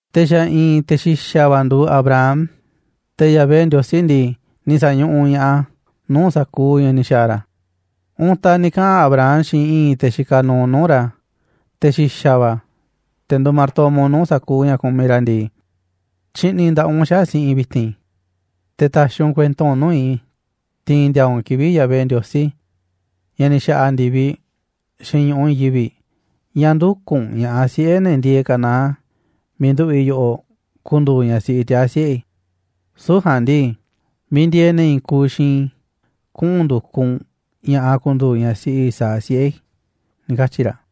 Te̱ xa̱ i̱i̱n te̱ xi̱xa̱ va̱ nduuꞌ Abraham, te̱ Yahvé Ndiosí ndii, ni̱ sa̱ñuꞌuꞌ ña̱ꞌaꞌ a̱ nuu̱ꞌ sa̱kuuꞌ ña̱ ni̱ xa̱a̱ ra̱. Untaꞌ ni̱ kaꞌa̱n Abraham xiinꞌ i̱i̱n te̱ xikaꞌ nuuꞌ nuu̱ꞌ ra̱, te̱ xi̱xa̱ va̱, te̱ nduuꞌ martomo nuu̱ꞌ sa̱kuuꞌ ña̱ kumiꞌ ra̱ ndii: ―Tyi̱ꞌni̱ nda̱ꞌaꞌ u̱nꞌ xaꞌa̱ꞌ si̱ꞌi̱n i̱ vi̱ti̱n, te̱ ta̱xi̱ u̱nꞌ kuento u̱nꞌ nuu̱ꞌ i̱ tiinꞌ ndiaa u̱nꞌ kivi̱ꞌ Yahvé Ndiosí, ña̱ ni̱ xa̱ꞌa̱ ndi̱viꞌ xiinꞌ ñu̱ꞌuꞌ i̱i̱n yivi̱ꞌ, ña̱ ndü̱kuꞌ u̱nꞌ ña̱ꞌaꞌ siꞌe̱ ne̱ ndieeꞌ Canaán miiꞌ nduꞌu̱ꞌ i̱ yoꞌoꞌ ku̱ndu̱u̱ ñaꞌ siꞌi tiaa̱ siꞌe̱ i̱. Süu̱ꞌ ja̱a̱nꞌ ndii, miiꞌ ndieeꞌ ne̱ i̱i̱n kuuꞌ xiinꞌ i̱ kuꞌu̱n ndu̱kuꞌ u̱nꞌ ña̱ꞌaꞌ ku̱ndu̱u̱ ñaꞌ siꞌi Isaac, siꞌe̱ i̱ ―ni̱ katyi̱ ra̱.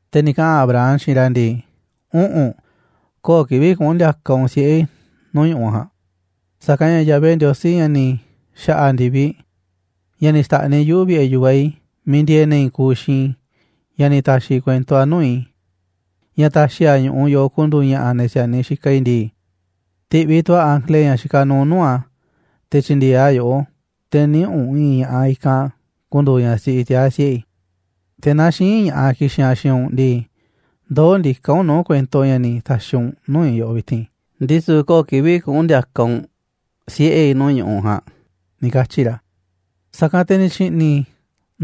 Te̱ ni̱ kaꞌa̱n Abraham xiinꞌ ra̱ ndii: ―Üꞌu̱nꞌ, köo̱ꞌ kivi̱ꞌ kuꞌu̱n ndi̱a̱ka̱ u̱nꞌ siꞌe̱ i̱ nuu̱ꞌ ñu̱ꞌuꞌ ja̱a̱nꞌ. Sa̱kanꞌ ña̱ Yahvé Ndiosí, ña̱ ni̱ xa̱ꞌa̱ ndi̱viꞌ, ña̱ ni̱ xta̱ꞌniꞌ yuꞌu̱ vi̱ꞌe̱ yu̱vaꞌ i̱ miiꞌ ndieeꞌ ne̱ i̱i̱n kuuꞌ xiinꞌ i̱, ña̱ ni̱ ta̱xi̱ kuento a̱ nuu̱ꞌ i̱, ña̱ ta̱xi̱ a̱ ñu̱ꞌuꞌ yoꞌoꞌ ku̱ndu̱u̱ ña̱ꞌa̱ ne̱ si̱a̱niꞌ xikaꞌ i̱ ndii, ti̱ꞌviꞌ tu̱ a̱ ángele ña̱ xikaꞌ nuuꞌ nuu̱ꞌ a̱ te̱ tyi̱ndi̱e̱eꞌ a̱ yoꞌó, te̱ niꞌi̱ꞌ u̱nꞌ i̱i̱n ña̱ꞌaꞌ i̱kanꞌ ku̱ndu̱u̱ ñaꞌ siꞌi tiaa̱ siꞌe̱ i̱. Te̱ naaꞌ xï̱i̱nꞌ ña̱ꞌaꞌ ki̱xi̱n aꞌ xiinꞌ u̱nꞌ ndii, ndoó ndiká u̱nꞌ nuu̱ꞌ kuento u̱nꞌ ña̱ ni̱ ta̱xi̱ u̱nꞌ nuu̱ꞌ i̱ yoꞌoꞌ vi̱ti̱n, ndisu̱ köo̱ꞌ kivi̱ꞌ kuꞌu̱n ndi̱a̱ka̱ u̱nꞌ siꞌe̱ i̱ nuu̱ꞌ ñu̱ꞌuꞌ ja̱a̱nꞌ ―ni̱ katyi̱ ra̱. Sa̱kanꞌ te̱ ni̱ tyi̱ꞌni̱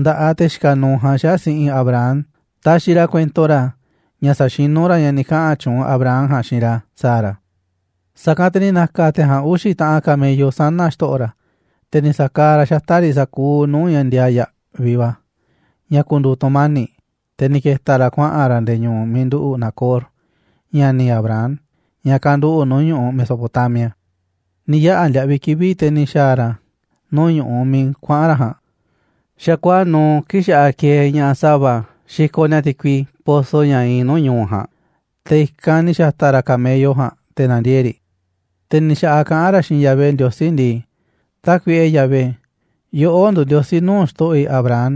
nda̱ꞌaꞌ te̱ xikaꞌ nuuꞌ ja̱a̱nꞌ xaꞌa̱ꞌ si̱ꞌi̱n Abraham, taxiꞌ ra̱ kuento ra̱ ña̱ sa̱xinú ra̱ ña̱ ni̱ kaꞌa̱n tyuunꞌ Abraham ja̱a̱nꞌ xiinꞌ ra̱ sa̱a̱ ra̱. Sa̱kanꞌ te̱ ni̱ na̱ka̱ te̱ ja̱a̱nꞌ uxi̱ taꞌan camello sana̱ xto̱ꞌo̱ ra̱, te̱ ni̱ sa̱kaaꞌ ra̱ xata̱ꞌ riꞌ sa̱kuuꞌ nuu̱ꞌ ña̱ ndiaa yaꞌviꞌ va̱, ña̱ ku̱ndu̱u̱ tu̱mani̱ꞌ, te̱ ni̱ ke̱ta̱ ra̱ kuaꞌa̱n ra̱ nde̱e̱ ñu̱u̱ miiꞌ nduꞌu̱ꞌ Nacor, ña̱ni̱ Abraham, ña̱ kanduꞌu̱ꞌ nuu̱ꞌ ñu̱ꞌuꞌ Mesopotamia. Ni̱ yaꞌa̱ ndiaꞌviꞌ kivi̱ꞌ, te̱ ni̱ xa̱a̱ ra̱ nuu̱ꞌ ñu̱ꞌuꞌ miiꞌ kuaꞌa̱n ra̱ ja̱a̱nꞌ, xa̱kuaa̱ꞌ nuuꞌ kii̱ꞌ xa̱ꞌaꞌ kieeꞌ ña̱ꞌaꞌ sa̱va̱ xikoꞌ ni̱a̱ ti̱kui pozo ña̱ iinꞌ nuu̱ꞌ ñu̱u̱ ja̱a̱nꞌ, te̱ i̱kanꞌ ni̱ xa̱ta̱ ra̱ camello ja̱a̱nꞌ te̱ na̱ndiee̱ꞌ riꞌ. Te̱ ni̱ xa̱ꞌaꞌ kaꞌán ra̱ xiinꞌ Yahvé Ndiosí ndii: ―Tákuiꞌe, Yahvé, yoꞌó nduuꞌ Ndiosí nuu̱ꞌ xto̱ꞌo̱ i̱ Abraham,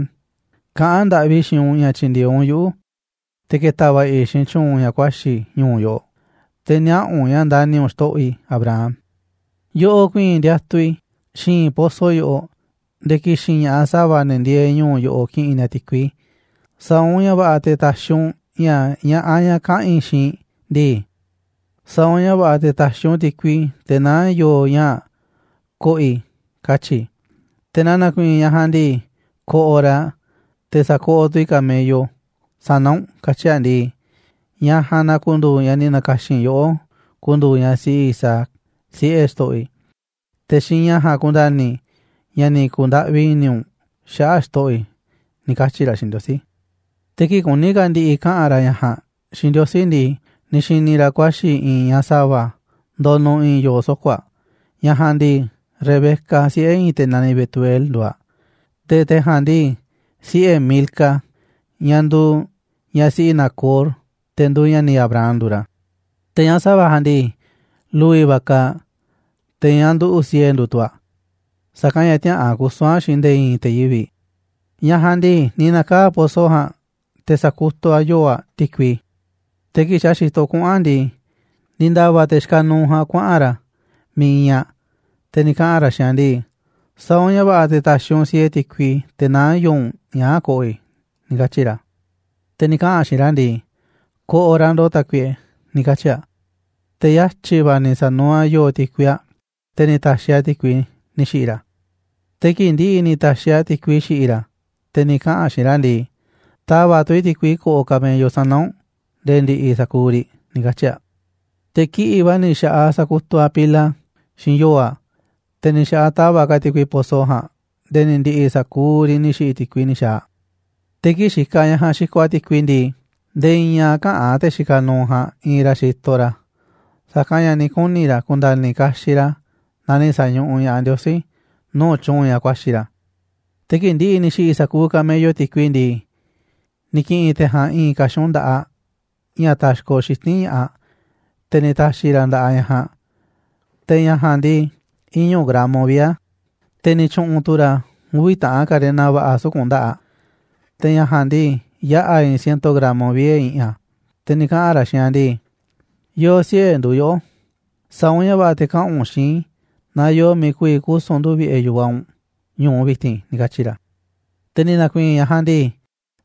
kaꞌán ndaꞌvi i̱ xiinꞌ u̱nꞌ ña̱ tyi̱ndi̱e̱eꞌ u̱nꞌ yuꞌu̱ te̱ ke̱ta̱ va̱ꞌa̱ i̱ xiinꞌ tyu̱u̱n ña̱ kuaxi̱ i̱ ñu̱u̱ yoꞌoꞌ, te̱ niaꞌa̱ u̱nꞌ ña̱ ndani̱ u̱nꞌ xto̱ꞌo̱ i̱ Abraham. Yoꞌoꞌ ku̱i̱i̱n i̱ ndiatuꞌ i̱ xi̱i̱nꞌ pozo yoꞌoꞌ, nde̱e̱ ki̱xi̱n ña̱ꞌaꞌ sa̱va̱, ne̱ ndieeꞌ ñu̱u̱ yoꞌoꞌ, ki̱ꞌi̱n ni̱a̱ ti̱kui. Sa̱a̱ u̱nꞌ ña̱ va̱ꞌa̱ te̱ ta̱xi̱ u̱nꞌ ña̱ ña̱ꞌaꞌ ñaꞌ kaꞌa̱n i̱ xiinꞌ ndii: «Sa̱a̱ u̱nꞌ ña̱ va̱ꞌa̱ te̱ ta̱xi̱ u̱nꞌ ti̱kui te̱ naá yo̱o̱ ñaa̱ꞌ ko̱ꞌo̱ i̱», katyi̱ i̱. Te̱ naaꞌ na̱ku̱i̱i̱n ñaꞌ ja̱a̱nꞌ ndii: «Ko̱ꞌo̱ raꞌ te̱ sa̱koꞌoꞌ tu̱ i̱ camello sana̱ u̱nꞌ», katyi̱ aꞌ ndii, ñaꞌ ja̱a̱nꞌ na ku̱ndu̱u̱ ñaꞌ ni̱ na̱ka̱xi̱n yoꞌó ku̱ndu̱u̱ ñaꞌ siꞌi Isaac, siꞌe̱ xto̱ꞌo̱ i̱. Te̱ xiinꞌ ña̱ ja̱a̱nꞌ ku̱nda̱ni̱ i̱ ña̱ ni̱ ku̱ndaꞌvi i̱ni̱ u̱nꞌ xaꞌa̱ꞌ xto̱ꞌo̱ i̱ ―ni̱ katyi̱ ra̱ xiinꞌ Ndiosí. Te̱ kii̱ꞌ kuní ka̱ ndi̱ꞌi̱ kaꞌa̱n ra̱ ña̱ ja̱a̱nꞌ xiinꞌ Ndiosí ndii, ni̱ xi̱ni̱ ra̱ kuaxi̱ i̱i̱n ñaꞌ sa̱va̱ ndonuꞌ i̱i̱n yo̱o̱ soko̱ aꞌ. Ñaꞌ ja̱a̱nꞌ ndii, Rebeca, siꞌe̱ i̱i̱n te̱ naniꞌ Betuel, nduuꞌ aꞌ. Te̱ te̱ ja̱a̱nꞌ ndii, siꞌe̱ Milca, ñaꞌ nduuꞌ ñaꞌ siꞌi Nacor, te̱ nduuꞌ ña̱ni̱ Abraham, nduuꞌ ra̱. Te̱ ñaꞌ sa̱va̱ ja̱a̱nꞌ ndii, lu̱vi̱ va̱ kaaꞌ aꞌ, te̱ ñaꞌ nduꞌu̱ꞌ siee nduuꞌ tu̱ aꞌ, sa̱kanꞌ ña̱ tiäꞌa̱an kusu̱n aꞌ xiinꞌ nde̱e̱ i̱i̱n te̱ yivi̱ꞌ. Ñaꞌ ja̱a̱nꞌ ndii, ni̱ na̱kaa̱ꞌ aꞌ pozo ja̱a̱nꞌ, te̱ sa̱kutuꞌ aꞌ yo̱o̱ aꞌ ti̱kui. Te̱ kii̱ꞌ xa̱ xitoꞌ kuꞌu̱n aꞌ ndii, ni̱ nda̱va̱ te̱ xikaꞌ nuuꞌ ja̱a̱nꞌ kuaꞌa̱n ra̱ miiꞌ iinꞌ aꞌ, te̱ ni̱ kaꞌa̱n ra̱ xiinꞌ aꞌ ndii: ―Sa̱a̱ u̱nꞌ ña̱ va̱ꞌa̱ te̱ ta̱xi̱ u̱nꞌ siee ti̱kui te̱ naá yo̱o̱ u̱nꞌ ñaa̱ꞌ ko̱ꞌo̱ i̱ ―ni̱ katyi̱ ra̱. Te̱ ni̱ kaꞌa̱n aꞌ xiinꞌ ra̱ ndii: ―Ko̱ꞌo̱ raꞌ ndo̱ꞌ, tákuiꞌe ―ni̱ katyi̱ aꞌ. Te̱ yatyi̱ va̱ ni̱ sa̱nuuꞌ aꞌ yo̱o̱ ti̱kui aꞌ, te̱ ni̱ ta̱xi̱ aꞌ ti̱kui ni̱ xi̱ꞌi̱ ra̱. Te̱ kii̱ꞌ ndi̱ꞌi̱ ni̱ ta̱xi̱ aꞌ ti̱kui xi̱ꞌi̱ ra̱, te̱ ni̱ kaꞌa̱n aꞌ xiinꞌ ra̱ ndii: ―Ta̱va̱ꞌ tu̱ i̱ ti̱kui ko̱ꞌo̱ camello sana̱ u̱nꞌ nde̱e̱ ndi̱ꞌi̱ sa̱kuuꞌ riꞌ ―ni̱ katyi̱ aꞌ. Te̱ kiꞌi̱ꞌ va̱ ni̱ xa̱ꞌaꞌ aꞌ sakutuꞌ aꞌ pila xiinꞌ yo̱o̱ aꞌ, te̱ ni̱ xa̱ꞌaꞌ aꞌ tava̱ꞌ ka̱ aꞌ ti̱kui pozo ja̱a̱nꞌ nde̱e̱ ni̱ ndi̱ꞌi̱ sa̱kuuꞌ riꞌ ni̱ xi̱ꞌi̱ ti̱kui ni̱ xa̱a̱ aꞌ. Te̱ kii̱ꞌ xikaꞌ ñaꞌ ja̱a̱nꞌ xikoꞌ aꞌ ti̱kui ndii, nde̱e̱ i̱i̱n a̱ käꞌán te̱ xikaꞌ nuuꞌ ja̱a̱nꞌ iinꞌ ra̱ xitoꞌ ra̱, sa̱kanꞌ ña̱ ni̱ kuni̱ ra̱ ku̱nda̱ni̱ kaxiꞌ ra̱ naaꞌ ni̱ sa̱ñuꞌuꞌ ña̱ꞌaꞌ Ndiosí nuu̱ꞌ tyu̱u̱n ña̱ kuaxi̱ ra̱. Te̱ kii̱ꞌ ndi̱ꞌi̱ ni̱ xi̱ꞌi̱ sa̱kuuꞌ camello ti̱kui ndii, ni̱ ki̱ꞌi̱n te̱ ja̱a̱nꞌ i̱i̱n ka̱xun nda̱ꞌaꞌ ña̱ taxkoꞌ xiti̱nꞌ ña̱ꞌaꞌ, te̱ ni̱ ta̱xi̱ ra̱ a̱ nda̱ꞌaꞌ ñaꞌ ja̱a̱nꞌ, te̱ ña̱ ja̱a̱nꞌ ndii, iñu̱ gramo vie̱ a̱, te̱ ni̱ tyu̱ꞌu̱n tu̱ ra̱ uvi̱ taꞌan karena va̱ꞌa̱ suku̱nꞌ nda̱ꞌaꞌ aꞌ, te̱ ña̱ ja̱a̱nꞌ ndii, yaꞌa̱ i̱i̱n ciento gramo vie̱ i̱ꞌi̱n a̱. Te̱ ni̱ kaꞌa̱n ra̱ xiinꞌ aꞌ ndii: ―¿Yo̱o̱ siꞌe̱ nduuꞌ yoꞌó? Sa̱a̱ u̱nꞌ ña̱ va̱ꞌa̱ te̱ kaꞌa̱n u̱nꞌ xiinꞌ i̱ naaꞌ yoo miiꞌ ku̱vi̱ kusu̱n ndu̱ vi̱ꞌe̱ yu̱vaꞌ u̱nꞌ ñu̱u vi̱ti̱n ―ni̱ katyi̱ ra̱. Te̱ ni̱ na̱ku̱i̱i̱n ñaꞌ ja̱a̱nꞌ ndii: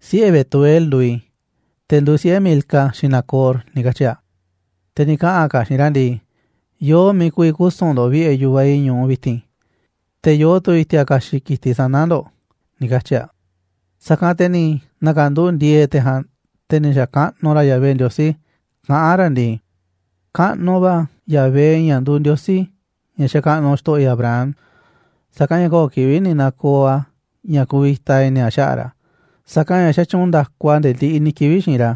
―Siꞌe̱ Betuel nduuꞌ i̱, te̱ nduuꞌ siꞌe̱ Milca xiinꞌ Nacor ―ni̱ katyi̱ aꞌ. Te̱ ni̱ kaꞌa̱n ka̱ aꞌ xiinꞌ ra̱ ndii: ―Yoo miiꞌ ku̱vi̱ kusu̱n ndo̱ꞌ vi̱ꞌe̱ yu̱vaꞌ i̱ ñu̱u vi̱ti̱n, te̱ yoo tu̱ i̱ti̱a̱ ka̱xi̱ꞌ ki̱tiꞌ sana̱ ndo̱ꞌ ―ni̱ katyi̱ aꞌ. Sa̱kanꞌ te̱ ni̱ na̱ka̱nduꞌu̱ꞌ ndi̱e̱e̱ te̱ ja̱a̱nꞌ, te̱ ni̱ xa̱kaꞌnuꞌ ra̱ Yahvé Ndiosí, kaꞌán ra̱ ndii: ―Kaꞌnuꞌ va̱ Yahvé, ña̱ nduuꞌ Ndiosí, ña̱ xakaꞌnuꞌ xto̱ꞌo̱ i̱ Abraham, sa̱kanꞌ ña̱ köo̱ꞌ kivi̱ꞌ ni̱ na̱ko̱o̱ a̱ ña̱ kuvita i̱ni̱ a̱ xaꞌa̱ꞌ ra̱, sa̱kanꞌ ña̱ xatyuunꞌ nda̱ku a̱ nde̱e̱ ndiꞌiꞌ ni̱ kivi̱ꞌ xiinꞌ ra̱,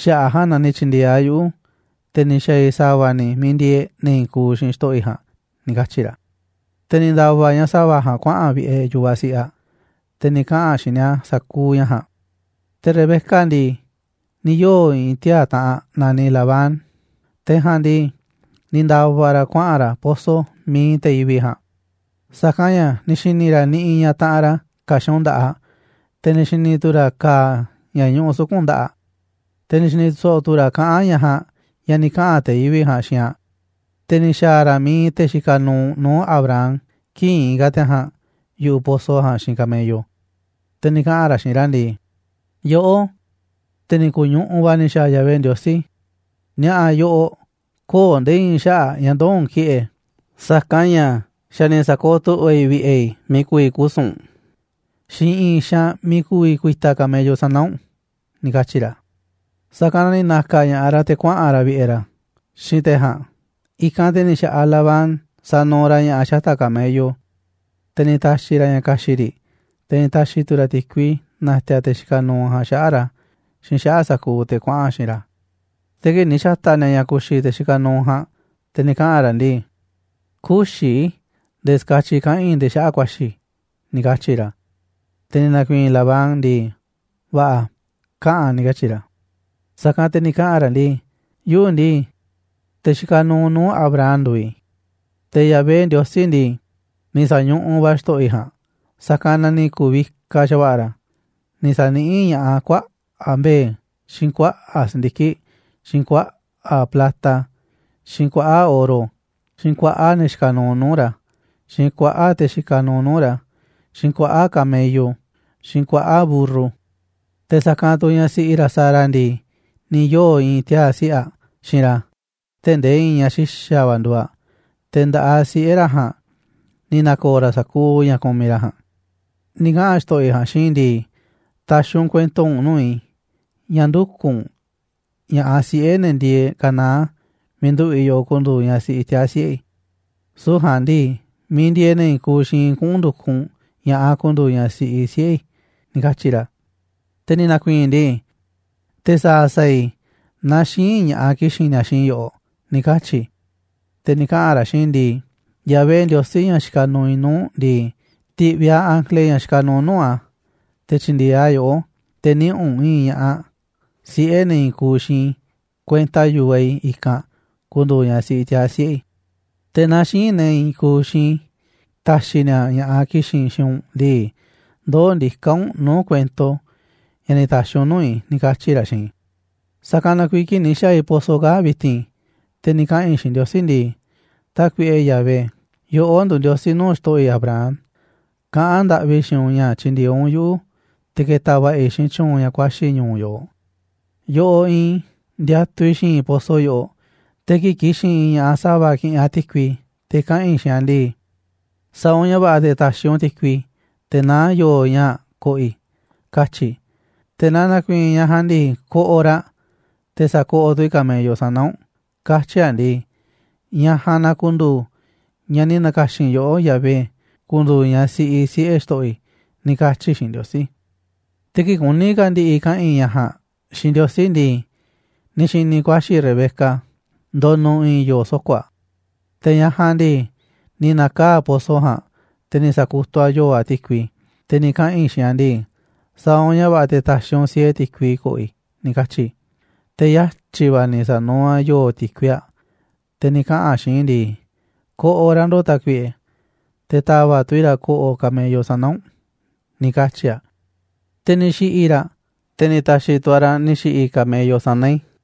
xaꞌa̱ꞌ a̱ ja̱a̱nꞌ na ni̱ tyi̱ndi̱e̱eꞌ a̱ yuꞌu̱, te̱ ni̱ xa̱a̱ i̱ sa̱va̱ ni̱ miiꞌ ndieeꞌ ne̱ i̱i̱n kuuꞌ xiinꞌ xto̱ꞌo̱ i̱ ja̱a̱nꞌ ―ni̱ katyi̱ ra̱. Te̱ ni̱ nda̱va̱ ñaꞌ sa̱va̱ ja̱a̱nꞌ kuaꞌa̱n aꞌ vi̱ꞌe̱ yu̱vaꞌ siꞌi aꞌ, te̱ ni̱ kaꞌa̱n aꞌ xiinꞌ ni̱a̱ sa̱kuuꞌ ña̱ ja̱a̱nꞌ. Te̱ Rebeca ndii, ni̱ yoo̱ i̱i̱n tiaa̱ taꞌanꞌ a̱ naniꞌ Labán, te̱ ja̱a̱nꞌ ndii, ni̱ nda̱va̱ ra̱ kuaꞌa̱n ra̱ pozo miiꞌ iinꞌ te̱ yivi̱ꞌ ja̱a̱nꞌ. Sa̱kanꞌ ña̱ ni̱ xi̱ni̱ ra̱ niꞌiꞌ ñaꞌ taꞌanꞌ ra̱ ka̱xun nda̱ꞌaꞌ, te̱ ni̱ xi̱ni̱ tu̱ ra̱ ka̱a̱ ña̱ ñuꞌuꞌ suku̱nꞌ nda̱ꞌaꞌ aꞌ, te̱ ni̱ xi̱ni̱ so̱ꞌo̱ tu̱ ra̱ kaꞌán ñaꞌ ja̱a̱nꞌ ña̱ ni̱ kaꞌa̱n te̱ yivi̱ꞌ ja̱a̱nꞌ xiinꞌ aꞌ. Te̱ ni̱ xa̱a̱ ra̱ miiꞌ iinꞌ te̱ xikaꞌ nuuꞌ nuu̱ꞌ Abraham kii̱ꞌ iinꞌ ka̱ te̱ ja̱a̱nꞌ yu̱ꞌuꞌ pozo ja̱a̱nꞌ xiinꞌ camello, te̱ ni̱ kaꞌa̱n ra̱ xiinꞌ ra̱ ndii: ―Yoꞌó, te̱ ni̱ ku̱ñuꞌuꞌ va̱ ni̱ xa̱a̱ Yahvé Ndiosí, ni̱a̱ꞌa̱ yoꞌoꞌ, köo̱ꞌ nde̱e̱ i̱i̱n xaꞌa̱ꞌ ña̱ ndoo̱ u̱nꞌ ki̱ꞌe̱, sa̱kanꞌ ña̱ xa̱ ni̱ sa̱kooꞌ tu̱ꞌva̱ i̱ vi̱ꞌe̱ i̱ miiꞌ ku̱vi̱ kusu̱n u̱nꞌ, xiinꞌ i̱i̱n xaanꞌ miiꞌ ku̱vi̱ ku̱i̱ta̱ camello sana̱ u̱nꞌ ―ni̱ katyi̱ ra̱. Sa̱kanꞌ na ni̱ na̱ka̱ ña̱ꞌaꞌ ra̱ te̱ kuaꞌa̱n ra̱ vi̱ꞌe̱ ra̱ xiinꞌ te̱ ja̱a̱nꞌ. I̱kanꞌ te̱ ni̱ xa̱ꞌaꞌ Labán sanuuꞌ ra̱ ña̱ꞌa̱ xata̱ꞌ camello, te̱ ni̱ ta̱xi̱ ra̱ ña̱ ka̱xi̱ꞌ riꞌ, te̱ ni̱ ta̱xi̱ tu̱ ra̱ ti̱kui na̱ti̱a̱ te̱ xikaꞌ nuuꞌ ja̱a̱nꞌ xaꞌa̱ꞌ ra̱ xiinꞌ xaꞌa̱ꞌ sa̱kuuꞌ te̱ kuaꞌa̱n xiinꞌ ra̱. Te̱ kii̱ꞌ ni̱ xa̱ta̱ ni̱a̱ ña̱ ku̱xi̱ te̱ xikaꞌ nuuꞌ ja̱a̱nꞌ, te̱ ni̱ kaꞌa̱n ra̱ ndii: ―Kü̱xi̱ i̱ nde̱e̱ ska̱tyiꞌ kaꞌa̱n i̱ ndee xaꞌa̱ꞌ ku̱a̱xi̱ i̱ ―ni̱ katyi̱ ra̱. Te̱ ni̱ na̱ku̱i̱i̱n Labán ndii: ―Va̱ꞌa̱, kaꞌa̱n ―ni̱ katyi̱ ra̱. Sa̱kanꞌ te̱ ni̱ kaꞌa̱n ra̱ ndii: ―Yuꞌu̱ ndii, te̱ xikaꞌ nuuꞌ nuu̱ꞌ Abraham nduuꞌ i̱. Te̱ Yahvé Ndiosí ndii, ni̱ sa̱ñuꞌuꞌ va̱ a̱ xto̱ꞌo̱ i̱ ja̱a̱nꞌ, sa̱kanꞌ na ni̱ ku̱u̱ vikaꞌ xa̱va̱ꞌa̱ ra̱, ni̱ sa̱niꞌíꞌ ña̱ꞌaꞌ a̱ kuaꞌa̱ꞌ mbe̱e̱, xiinꞌ kuaꞌa̱ꞌ si̱ndiki̱ꞌ, xiinꞌ kuaꞌa̱ꞌ plata, xiinꞌ kuaꞌa̱ꞌ oro, xiinꞌ kuaꞌa̱ꞌ ne̱ xikaꞌ nuuꞌ nuu̱ꞌ ra̱, xiinꞌ kuaꞌa̱ꞌ te̱ xikaꞌ nuuꞌ ra̱, xiinꞌ kuaꞌa̱ꞌ camello, xiinꞌ kuaꞌa̱ꞌ mburru. Te̱ sa̱kanꞌ tu̱ ñaꞌ siꞌi ra̱ Sara ndii, ni̱ yoo̱ i̱i̱n tiaa̱ siꞌe̱ aꞌ xiinꞌ ra̱ tee̱ꞌ ndee i̱i̱n ñaꞌ xa̱ xi̱xa̱ va̱ nduuꞌ aꞌ, te̱ nda̱ꞌaꞌ siꞌe̱ ra̱ ja̱a̱nꞌ ni̱ na̱ko̱o̱ ra̱ sa̱kuuꞌ ña̱ kumiꞌ ra̱ ja̱a̱nꞌ. Ni̱ kaꞌa̱n xto̱ꞌo̱ i̱ ja̱a̱nꞌ xiinꞌ i̱ ndii: «Ta̱xi̱ u̱nꞌ kuento u̱nꞌ nuu̱ꞌ i̱ ña̱ ndü̱kuꞌ u̱nꞌ ña̱ꞌaꞌ siꞌe̱ ne̱ ndieeꞌ Canaán miiꞌ nduꞌu̱ꞌ i̱ yoꞌoꞌ ku̱ndu̱u̱ ñaꞌ siꞌi tiaa̱ siꞌe̱ i̱, süu̱ꞌ ja̱a̱nꞌ ndii, miiꞌ ndieeꞌ ne̱ i̱i̱n kuuꞌ xiinꞌ i̱ kuꞌu̱n ndu̱kuꞌ u̱nꞌ ña̱ꞌaꞌ ku̱ndu̱u̱ ñaꞌ siꞌi siꞌe̱ i̱», ni̱ katyi̱ ra̱. Te̱ ni̱ na̱ku̱i̱i̱n i̱ ndii: «¿Te̱ sa̱a̱ sa̱a̱ i̱ naaꞌ xï̱i̱nꞌ ña̱ꞌaꞌ ki̱xi̱n ni̱a̱ xiinꞌ i̱ yoꞌoꞌ?», ni̱ katyi̱ i̱. Te̱ ni̱ kaꞌa̱n ra̱ xiinꞌ i̱ ndii: «Yahvé Ndiosí, ña̱ xikaꞌ nuuꞌ i̱ nuu̱ꞌ ndii, ti̱ꞌviꞌ a̱ ángele ña̱ xikaꞌ nuuꞌ nuu̱ꞌ a̱ te̱ tyi̱ndi̱e̱eꞌ a̱ yoꞌó, te̱ niꞌi̱ꞌ u̱nꞌ i̱i̱n ña̱ꞌaꞌ siꞌe̱ ne̱ i̱i̱n kuuꞌ xiinꞌ i̱ kuenta yu̱vaꞌ i̱ i̱kanꞌ ku̱ndu̱u̱ ñaꞌ siꞌi tiaa̱ siꞌe̱ i̱. Te̱ naaꞌ xï̱i̱nꞌ ne̱ i̱i̱n kuuꞌ xiinꞌ i̱ ta̱xi̱ ni̱a̱ ña̱ꞌaꞌ ki̱xi̱n xiinꞌ u̱nꞌ ndii, ndoó ndiká u̱nꞌ nuu̱ꞌ kuento ña̱ ni̱ ta̱xi̱ u̱nꞌ nuu̱ꞌ i̱», ni̱ katyi̱ ra̱ xiinꞌ i̱. Sa̱kanꞌ na kuiiꞌ kii̱ꞌ ni̱ xa̱a̱ i̱ pozo kaa̱ꞌ vi̱ti̱n, te̱ ni̱ kaꞌa̱n i̱ xiinꞌ Ndiosí ndii: «Tákuiꞌe, Yahvé, yoꞌó nduuꞌ Ndiosí nuu̱ꞌ xto̱ꞌo̱ i̱ Abraham, kaꞌán ndaꞌvi i̱ xiinꞌ u̱nꞌ ña̱ tyi̱ndi̱e̱eꞌ u̱nꞌ yuꞌu̱ te̱ ke̱ta̱ va̱ꞌa̱ i̱ xiinꞌ tyu̱u̱n ña̱ kuaxi̱ i̱ ñu̱u̱ yoꞌoꞌ. Yoꞌoꞌ iinꞌ i̱ ndiatuꞌ i̱ xi̱i̱nꞌ pozo yoꞌoꞌ, te̱ kii̱ꞌ ki̱xi̱n i̱i̱n ña̱ꞌaꞌ sa̱va̱ ki̱ꞌi̱n aꞌ ti̱kui, te̱ kaꞌa̱n i̱ xiinꞌ aꞌ ndii: «Sa̱a̱ u̱nꞌ ña̱ va̱ꞌa̱ te̱ ta̱xi̱ u̱nꞌ ti̱kui te̱ naá yo̱o̱ ñaa̱ꞌ ko̱ꞌo̱ i̱», katyi̱ i̱. Te̱ naaꞌ na̱ku̱i̱i̱n ñaꞌ ja̱a̱nꞌ ndii: «Ko̱ꞌo̱ raꞌ, te̱ sa̱koꞌoꞌ tu̱ i̱ camello sana̱ u̱nꞌ», katyi̱ aꞌ ndii, ñaꞌ ja̱a̱nꞌ na ku̱ndu̱u̱ ñaꞌ ni̱ na̱ka̱xi̱n yoꞌó, Yahvé, ku̱ndu̱u̱ ñaꞌ siꞌi siꞌe̱ xto̱ꞌo̱ i̱», ni̱ katyi̱ i̱ xiinꞌ Ndiosí. Te̱ kii̱ꞌ kuní ka̱ ndi̱ꞌi̱ kaꞌa̱n i̱ ña̱ ja̱a̱nꞌ xiinꞌ Ndiosí ndii, ni̱ xi̱ni̱ i̱ kuaxi̱ Rebeca ndonuꞌ i̱i̱n yo̱o̱ soko̱ aꞌ. Te̱ ñaꞌ ja̱a̱nꞌ ndii, ni̱ na̱kaa̱ꞌ aꞌ pozo ja̱a̱nꞌ, te̱ ni̱ sa̱kutuꞌ aꞌ yo̱o̱ aꞌ ti̱kui, te̱ ni̱ kaꞌa̱n i̱ xiinꞌ aꞌ ndii: «Sa̱a̱ u̱nꞌ ña̱ va̱ꞌa̱ te̱ ta̱xi̱ u̱nꞌ siee ti̱kui ko̱ꞌo̱ i̱», ni̱ katyi̱ i̱. ’Te̱ yatyi̱ va̱ ni̱ sa̱nuuꞌ aꞌ yo̱o̱ ti̱kui aꞌ, te̱ ni̱ kaꞌa̱n aꞌ xiinꞌ i̱ ndii: «Ko̱ꞌo̱ raꞌ ndo̱ꞌ, tákuiꞌe, te̱ ta̱va̱ꞌ tu̱ i̱ raꞌ ko̱ꞌo̱ camello sana̱ u̱nꞌ», ni̱ katyi̱ aꞌ. Te̱ ni̱ xi̱ꞌi̱ i̱ raꞌ, te̱ ni̱ ta̱xi̱ tu̱ aꞌ raꞌ ni̱ xi̱ꞌi̱ camello sana̱ i̱.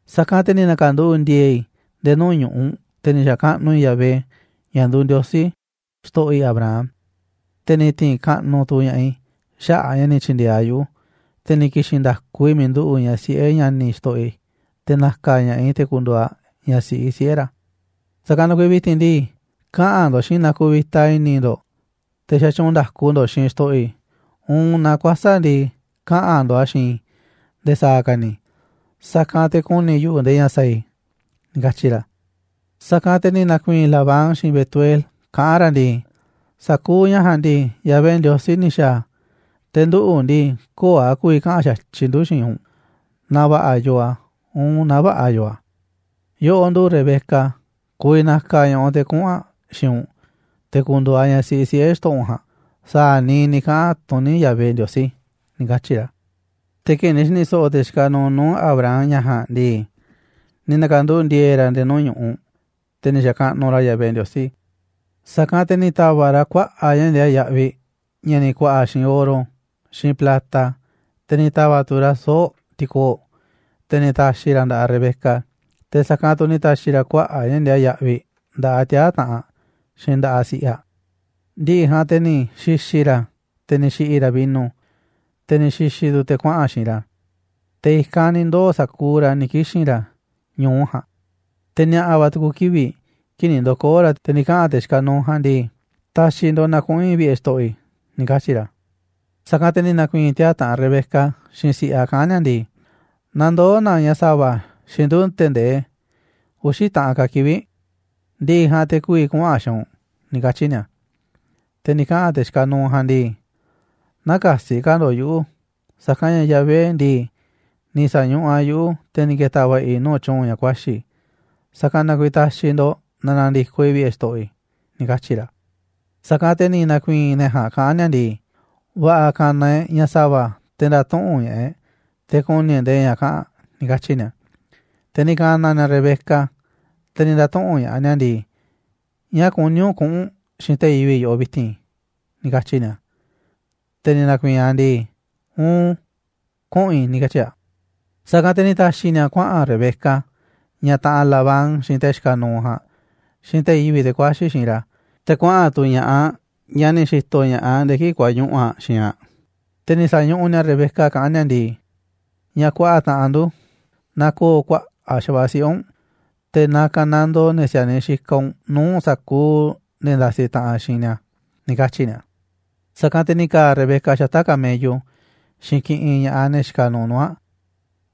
Sa̱kanꞌ te̱ ni̱ na̱ka̱nduꞌu̱ꞌ ndi̱e̱e̱ i̱ nde̱e̱ nuu̱ꞌ ñu̱ꞌuꞌ, te̱ ni̱ xa̱kaꞌnuꞌ i̱ Yahvé, ña̱ nduuꞌ Ndiosí xto̱ꞌo̱ i̱ Abraham, te̱ ni̱ ti̱i̱n kaꞌnuꞌ tu̱ ña̱ꞌaꞌ i̱ xaꞌa̱ꞌ a̱ ña̱ ni̱ tyi̱ndi̱e̱eꞌ a̱ yuꞌu̱, te̱ ni̱ ki̱xi̱n nda̱ku i̱ miiꞌ nduꞌu̱ꞌ ñaꞌ siꞌe̱ ña̱ni̱ xto̱ꞌo̱ i̱, te̱ na̱ka̱ ña̱ꞌaꞌ i̱ te̱ ku̱ndu̱u̱ aꞌ ñaꞌ siꞌi siꞌe̱ ra̱. Sa̱kanꞌ na kuiiꞌ vi̱ti̱n ndii, kaꞌa̱n ndo̱ꞌ xiinꞌ i̱ naaꞌ kuvita i̱ni̱ ndo̱ꞌ, te̱ xatyuunꞌ nda̱ku ndo̱ꞌ xiinꞌ xto̱ꞌo̱ i̱, uun naaꞌ kuäsa̱ꞌ ndii, kaꞌa̱n ndo̱ꞌ a̱ xiinꞌ i̱ nde̱e̱ sa̱a̱ ka̱ ni̱, sa̱kanꞌ te̱ ku̱ni̱ yuꞌu̱ nde̱e̱ ña̱ sa̱a̱ i̱ ―ni̱ katyi̱ ra̱. Sa̱kanꞌ te̱ ni̱ na̱ku̱i̱i̱n Labán, xiinꞌ Betuel, kaꞌán ra̱ ndii: ―Sa̱kuuꞌ ña̱ ja̱a̱nꞌ ndii, Yahvé Ndiosí ni̱ xa̱a̱ a̱, te̱ nduꞌu̱ ndii, köo̱ꞌ a̱ ku̱vi̱ kaꞌa̱n xa̱tyiꞌ ndu̱ xiinꞌ u̱nꞌ, naaꞌ va̱ꞌa̱ yoo a̱, uun naaꞌ vä̱ꞌa̱ yoo a̱. Yoꞌoꞌ nduꞌu̱ꞌ Rebeca, ku̱vi̱ na̱ka̱ ña̱ꞌaꞌ u̱nꞌ te̱ kuꞌu̱n aꞌ xiinꞌ u̱nꞌ, te̱ ku̱ndu̱u̱ aꞌ ñaꞌ siꞌi siꞌe̱ xto̱ꞌo̱ u̱nꞌ ja̱a̱nꞌ sa̱a̱ niiꞌ ni̱ kaꞌa̱n tuní Yahvé Ndiosí ―ni̱ katyi̱ ra̱. Te̱ kii̱ꞌ ni̱ xi̱ni̱ so̱ꞌo̱ te̱ xikaꞌ nuuꞌ nuu̱ꞌ Abraham ña̱ ja̱a̱nꞌ ndii, ni̱ na̱ka̱nduꞌu̱ꞌ ndi̱e̱e̱ ra̱ nde̱e̱ nuu̱ꞌ ñu̱ꞌuꞌ, te̱ ni̱ xa̱kaꞌnuꞌ ra̱ Yahvé Ndiosí. Sa̱kanꞌ te̱ ni̱ ta̱va̱ꞌ ra̱ kuaꞌa̱ꞌ ña̱ ndiaa yaꞌviꞌ ña̱ ni̱ ku̱a̱ꞌa̱ xiinꞌ oro, xiinꞌ plata, te̱ ni̱ ta̱va̱ꞌ tu̱ ra̱ soo̱ꞌ ti̱koo̱ꞌ, te̱ ni̱ ta̱xi̱ ra̱ a̱ nda̱ꞌaꞌ Rebeca, te̱ sa̱kanꞌ tu̱ ni̱ ta̱xi̱ ra̱ kuaꞌa̱ꞌ ña̱ ndiaa yaꞌviꞌ nda̱ꞌaꞌ tiaa̱ taꞌanꞌ aꞌ, xiinꞌ nda̱ꞌaꞌ si̱ꞌiꞌ aꞌ. Ndi̱ꞌi̱ ja̱a̱nꞌ te̱ ni̱ xi̱xi̱ ra̱, te̱ ni̱ xi̱ꞌi̱ ra̱ vino, te̱ ni̱ xi̱xi̱ tu̱ te̱ kuaꞌa̱n xiinꞌ ra̱, te̱ i̱kanꞌ ni̱ ndoo̱ sa̱kuuꞌ ra̱ ni̱ ki̱xi̱n ra̱ ñu̱u ja̱a̱nꞌ. Te̱ ni̱a̱ꞌa̱ va̱ tu̱ku̱ kivi̱ꞌ, kii̱ꞌ ni̱ ndo̱koo̱ ra̱, te̱ ni̱ kaꞌa̱n te̱ xikaꞌ nuuꞌ ja̱a̱nꞌ ndii: ―Ta̱xi̱ ndo̱ꞌ na kuꞌu̱n i̱ vi̱ꞌe̱ xto̱ꞌo̱ i̱ ―ni̱ katyi̱ ra̱. Sa̱kanꞌ te̱ ni̱ na̱ku̱i̱i̱n tiaa̱ taꞌanꞌ Rebeca, xiinꞌ si̱ꞌiꞌ aꞌ kaꞌán ni̱a̱ ndii: ―Na ndoo̱ na ñaꞌ sa̱va̱ xiinꞌ ndu̱ tee̱ꞌ ndee uxi̱ taꞌan ka̱ kivi̱ꞌ, ndi̱ꞌi̱ ja̱a̱nꞌ te̱ ku̱vi̱ kuꞌu̱n aꞌ xiinꞌ u̱nꞌ ―ni̱ katyi̱ ni̱a̱. Te̱ ni̱ kaꞌa̱n te̱ xikaꞌ nuuꞌ ja̱a̱nꞌ ndii: ―Nä̱ka̱si̱ ka̱ ndo̱ꞌ yuꞌu̱, sa̱kanꞌ ña̱ Yahvé ndii, ni̱ sa̱ñuꞌuꞌ a̱ yuꞌu̱, te̱ ni̱ ke̱ta̱ va̱ꞌa̱ i̱ nuu̱ꞌ tyu̱u̱n ña̱ kuaxi̱ i̱, sa̱kanꞌ na kuiiꞌ ta̱xi̱ ndo̱ꞌ na na̱ndi̱koꞌ i̱ vi̱ꞌe̱ xto̱ꞌo̱ i̱ ―ni̱ katyi̱ ra̱. Sa̱kanꞌ te̱ ni̱ na̱ku̱i̱i̱n ne̱ ja̱a̱nꞌ kaꞌán ni̱a̱ ndii: ―Va̱ꞌa̱ ka̱na̱ e̱ꞌ ñaꞌ sa̱va̱ te̱ nda̱tuꞌu̱nꞌ ña̱ꞌaꞌ e̱ꞌ, te̱ ku̱ni̱ e̱ꞌ nde̱e̱ ña̱ kaꞌa̱n aꞌ ―ni̱ katyi̱ ni̱a̱. Te̱ ni̱ ka̱na̱ ni̱a̱ Rebeca, te̱ ni̱ nda̱tuꞌu̱nꞌ ña̱ꞌaꞌ ni̱a̱ ndii: ―¿Ñáá kuní u̱nꞌ kuꞌu̱n u̱nꞌ xiinꞌ te̱ yivi̱ꞌ yoꞌoꞌ vi̱ti̱n? ―ni̱ katyi̱ ni̱a̱. Te̱ ni̱ na̱ku̱i̱i̱n aꞌ ndii: ―Uun, kuꞌu̱n i̱ ―ni̱ katyi̱ aꞌ. Sa̱kanꞌ te̱ ni̱ ta̱xi̱ ni̱a̱ kuaꞌa̱n Rebeca, ñaꞌ taꞌanꞌ Labán, xiinꞌ te̱ xikaꞌ nuuꞌ ja̱a̱nꞌ, xiinꞌ te̱ yivi̱ꞌ te̱ kuaxi̱ xiinꞌ ra̱, te̱ kuaꞌa̱n tu̱ ña̱ꞌaꞌ, ñaꞌ ni̱ xi̱to̱ ña̱ꞌaꞌ nde̱e̱ kii̱ꞌ kuañuꞌu̱ aꞌ xiinꞌ aꞌ. Te̱ ni̱ sa̱ñuꞌuꞌ ni̱a̱ Rebeca kaꞌán ni̱a̱ ndii: ―Ñaꞌ kuaꞌa taꞌanꞌ ndu̱, na ko̱o̱ kuaꞌa̱ꞌ xa̱va̱ꞌa̱ siꞌe̱ u̱nꞌ, te̱ na ka̱nandoo ne̱ si̱a̱niꞌ xikaꞌ u̱nꞌ nuu̱ꞌ sa̱kuuꞌ ne̱ ndasiꞌ taꞌanꞌ xiinꞌ ni̱a̱ ―ni̱ katyi̱ ni̱a̱. Sa̱kanꞌ te̱ ni̱ ka̱a̱ Rebeca xata̱ꞌ camello xiinꞌ kiꞌinꞌ ña̱ꞌaꞌ ne̱ xikaꞌ nuuꞌ nuu̱ꞌ aꞌ,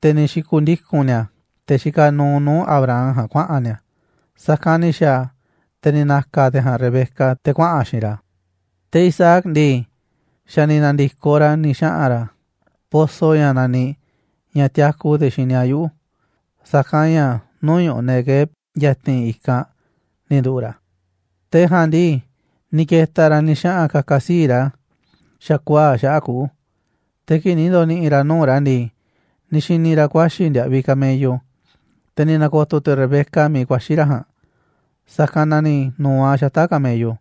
te̱ ni̱ xi̱ku̱ndiku̱n ni̱a̱ te̱ xikaꞌ nuuꞌ nuu̱ꞌ Abraham ja̱a̱nꞌ kuaꞌa̱n ni̱a̱. Sa̱kanꞌ ni̱ xa̱a̱ a̱, te̱ ni̱ na̱ka̱ te̱ ja̱a̱nꞌ Rebeca, te̱ kuaꞌa̱n aꞌ xiinꞌ ra̱. Te̱ Isaac ndii, xa̱ ni̱ na̱ndi̱koꞌ ra̱ ni̱ xaꞌa̱n ra̱ pozo ña̱ naniꞌ «ña̱ tiaku te̱ xini a̱ yuꞌu̱», sa̱kanꞌ ña̱ nuu̱ꞌ ñu̱ꞌuꞌ Neguev ya̱ti̱n i̱kanꞌ ni̱ nduꞌu̱ꞌ ra̱. Te̱ ja̱a̱nꞌ ndii, ni̱ ke̱ta̱ ra̱ ni̱ xaꞌa̱n ka̱ka̱ sii̱ꞌ ra̱ xa̱kuaa̱ꞌ xaꞌa̱ꞌ kuꞌu̱. Te̱ kii̱ꞌ ni̱ ndo̱ni̱ꞌi̱ ra̱ nuu̱ꞌ ra̱ ndii, ni̱ xi̱ni̱ ra̱ ku̱a̱xi̱ ndiaꞌviꞌ camello. Te̱ ni̱ na̱ko̱to̱ tu̱ Rebeca miiꞌ kuaxi̱ ra̱ ja̱a̱nꞌ, sa̱kanꞌ na ni̱ nu̱u̱ aꞌ xata̱ꞌ camello,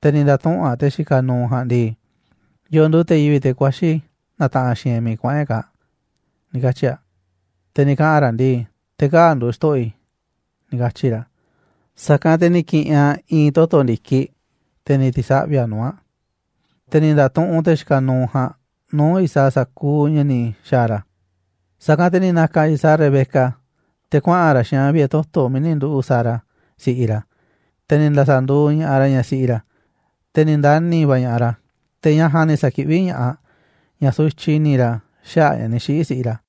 te̱ ni̱ nda̱tuꞌu̱nꞌ aꞌ te̱ xikaꞌ nuuꞌ ja̱a̱nꞌ ndii: ―¿Yo̱o̱ nduuꞌ te̱ yivi̱ꞌ, te̱ kuaxi̱ na̱taꞌanꞌ xiinꞌ e̱ꞌ miiꞌ kuaꞌa̱n e̱ꞌ kaa̱ꞌ? ―ni̱ katyi̱ aꞌ. Te̱ ni̱ kaꞌa̱n ra̱ ndii: ―Te̱ kaa̱ꞌ nduuꞌ xto̱ꞌo̱ i̱ ―ni̱ katyi̱ ra̱. Sa̱kanꞌ te̱ ni̱ ki̱ꞌi̱n aꞌ i̱i̱n toto̱ ndi̱kiꞌ, te̱ ni̱ ti̱saꞌvi̱ aꞌ nuu̱ꞌ aꞌ. Te̱ ni̱ nda̱tuꞌunꞌ te̱ xikaꞌ nuuꞌ ja̱a̱nꞌ nuu̱ꞌ Isaac sa̱kuuꞌ ña̱ ni̱ xa̱a̱ ra̱. Sa̱kanꞌ te̱ ni̱ na̱ka̱ Isaac Rebeca te̱ kuaꞌa̱n ra̱ xiinꞌ aꞌ vi̱ꞌe̱ toto̱ miiꞌ ni̱ nduꞌu̱ꞌ Sara, si̱ꞌiꞌ ra̱, te̱ ni̱ nda̱sa̱nduuꞌ ña̱ꞌaꞌ ra̱ ñaꞌ siꞌi ra̱. Te̱ ni̱ ndani̱ va̱ ña̱ꞌaꞌ ra̱, te̱ ñaꞌ ja̱a̱nꞌ ni̱ sa̱kiꞌví ña̱ꞌaꞌ ña̱ sutyiꞌ i̱ni̱ ra̱ xaꞌa̱ꞌ a̱ ña̱ ni̱ xiꞌi̱ si̱ꞌiꞌ ra̱.